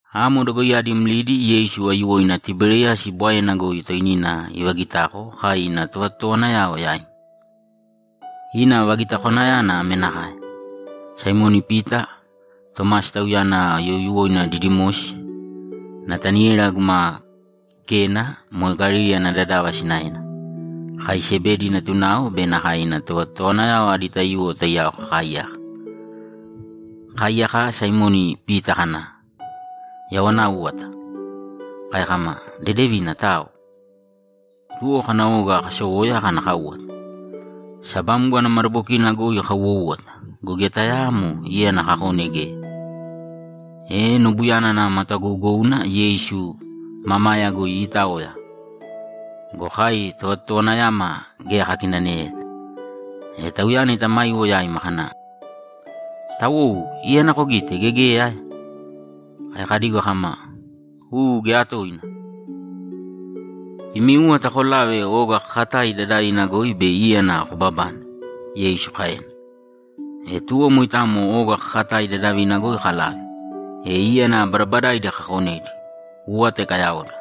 Amo dogoiyadi mlidi Yeisu aiyuwoina Tiberiyasi Bwaena goi toinina ivagitako kai ina tovatotowanayao yaima. Ina vagitakwanayana ame nakae: Saimoni Pita, Tomasi (tauyana youyuwoina Didimosi), Nataniela guma Kena (moe Galili ana dadava sinaena), kai Sebedi natunao be nakae ina tovatotowanayao adi taiyuwo taiyao kakaaiyaka. Kakaaiyaka, Saimoni Pita kana, ‘Yau ana áuwata.’ Kai kama, ‘Dedevina, tao.’ Tuwo kana oga kasowoya kana káuwata. Sabamgo ana madabokina goi kauwoúwata go, geya tayaamo íyana kakone geya. E nobuyana nava matagougouna Yeisu mamaya goi iitaoya go, kai tovatotowanayama geya kakinaneyeta. E Tauyana itamaiwo yaima kana, ‘Tawou! Íyana kogite, gea geya ae?’ Kai kadigo kama, ‘U, geya toina!’ ‘Imi úwata kolāve oga kakatai dadavina goi bei íyana kobabane’, Yeisu kaena. E tuwo moitamo oga kakatai dadavina goi kalave, e íyana badabadaidi kakonedi, úwata ikayaoda,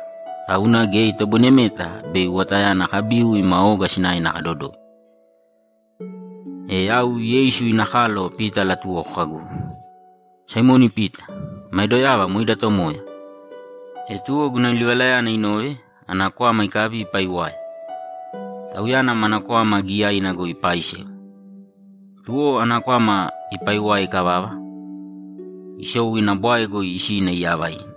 tauna geya itoboinemeta bei uwatayana kabiu ima oga sinaena kadodoi. E yau Yeisu ina kalo Pita alatuwoko kagu, ‘Saimoni Pita, mae doyava moe ida Tomoya!’ E tuwo guna livalayana inove, ana kwama ikabi ipaiwae. Tauyana mana kwama giyaina goi ipaaisewa. Tuwo ana kwama ipaiwae ikavava, isou ina bwae goi isina iyava ina.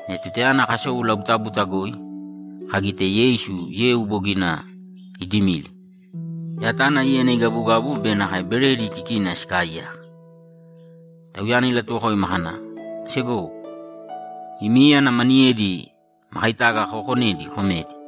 E tutayana kasou labutabuta goi, kagite Yeisu yeu bogina idimili, yatana íyana igabugabu be nakae beredi kikina sikaaiyaka. Tauyana ilatuwokoima kana, ‘Segowo, imi íyana maniyedi makaitaga kookonedi komēdi.’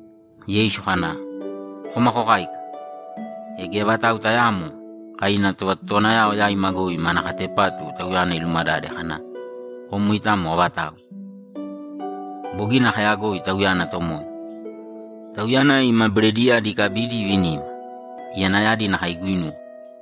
Yeisu kana, ‘Kōma kokāika!’ E geya vatau tayaamo kai ina tovatotowanayao yaima goi mana katepatu Tauyana ilumadade kana, ‘Kom moitamo avatau?’ Bogina kayagoi Tauyana Tomoya. Tauyana ima berediyadi ikabidi ivinima. Iyanayadi nakae iguinuwe.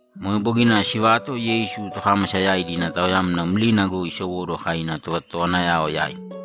Moe bogina sivato Yeisu tokámasa yaidi ina taoyamna mlina goi isowóduwo kai ina tovatotowanayao yaima.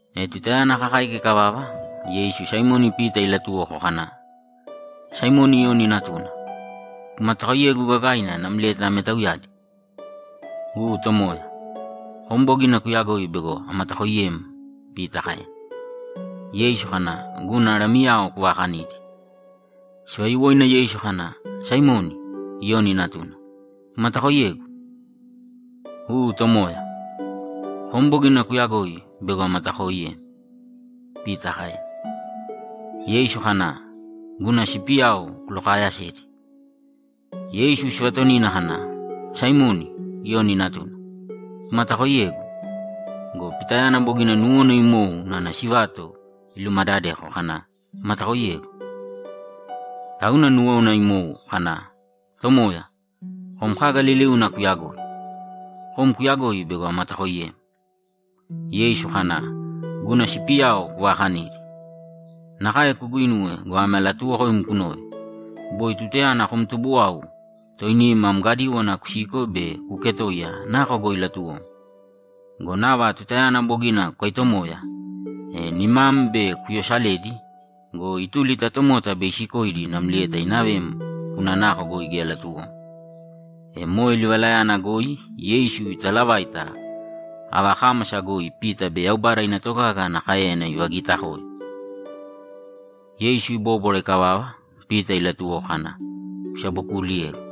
E tutayana kakáika ikavava, Yeisu Saimoni Pita ilatuwoko kana, ‘Saimoni Iyoni natuna, kumatakoiyegu gagaina namlieta ame tauyadi?’ ‘U, Tomoya. Kom bogina kuyagoi bego amatakooiyem’, Pita kaena. Yeisu kana, ‘Guna lamiyao kuvaakanīdi.’ Sivayuwoina Yeisu kana, ‘Saimoni, Iyoni natuna, kumatakoiyegu?’ ‘U, Tomoya. Kom bogina kuyagoi bego amatakooiyem’, Pita kaena. Yeisu kana, ‘Guna sipiyao kulokaayasēdi.’ Yeisu sivatonina kana, ‘Saimoni, Iyoni natuna, kumatakoiyegu?’ Go Pitayana bogina nuwona imou unana sivato ilumadadeko kana, ‘Kumatakoiyegu?’ Tauna nuwona imou kana, ‘Tomoya, kom kaga liliuna kuyagoi. Kom kuyagoi bego amatakooiyem.’ Yeisu kana, ‘Guna sipiyao kuvaakanīdi. Nakae kuguinuwe go, ame alatuuwokoim kunōve: Boi tutayana kom tubuwau, toinim am gadíwana kusiko be kuuketoiya nako goi latuwom. Go nava tutayana bogina kukaitomoya, e nimam bei kuyosaledi go, ituli ta tomota be isikoidi namlieta inavem kuna nako goi geya latuwom.’ E moe livalayana goi Yeisu italavaita ava kámasa goi Pita bei Yaubada ina togaga ana káeyana ivagitakoe. Yeisu ibóbwara ikavava, Pita ilatuwoko kana, ‘Kusabokuuliyēgu.’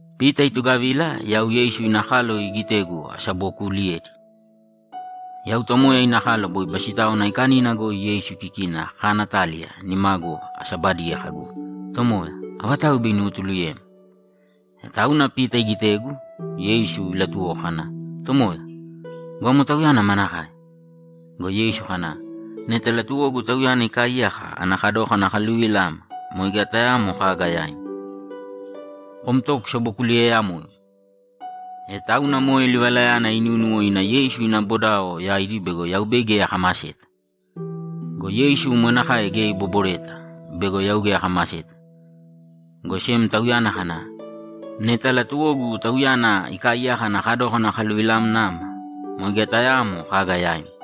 Pita itugavila yau Yeisu ina kalo igitegu asabokuuliyedi. Yau Tomoya ina kalo boi Basitáwana Aikanina goi Yeisu kikina akanaataliya nimagu asabadiye kagu, ‘Tomoya, avatau bei inuwotuluyem?’ E tauna Pita igitegu, Yeisu ilatuwoko kana, ‘Tomoya, go amo tauyana manakae?’ Go Yeisu kana, ‘Neta latuwogu tauyana ikaaiyaka ana kadókana akaluvila ama, moe geya tayaamo kaga yaim. Kom to kusabokuliyeeyamōigu.’ E tauna moe livalayana inúnuwo ina Yeisu ina bodao yaidi bego yau bei geya akamaseta. Go Yeisu moe nakae geya ibobwareta bego yau geya akamaseta, go sem Tauyana kana, ‘Neta latuwogu tauyana ikaaiyaka ana kadókana akaluvilamna ama, moe geya tayaamo kaga yaim.’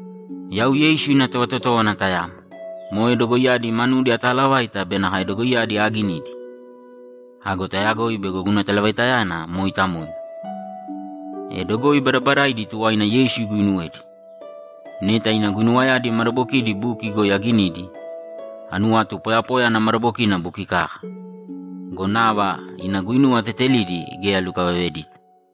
Yau Yeisu ina tovatotówana tayamo, moe dogoiyadi manudi ataalavaita be nakae dogoiyadi aaginidi. Ago tayagoi bego guna talavaitayana mooitamoina. E dogoi badabadaidi tuwaina Yeisu iguinuwedi. Neta ina guinuwayadi madabokidi buki goi aginidi, anuwatu poyapoya ana madabokina buki kaka go, nava ina guinuwa tetelidi geya alukavavedita.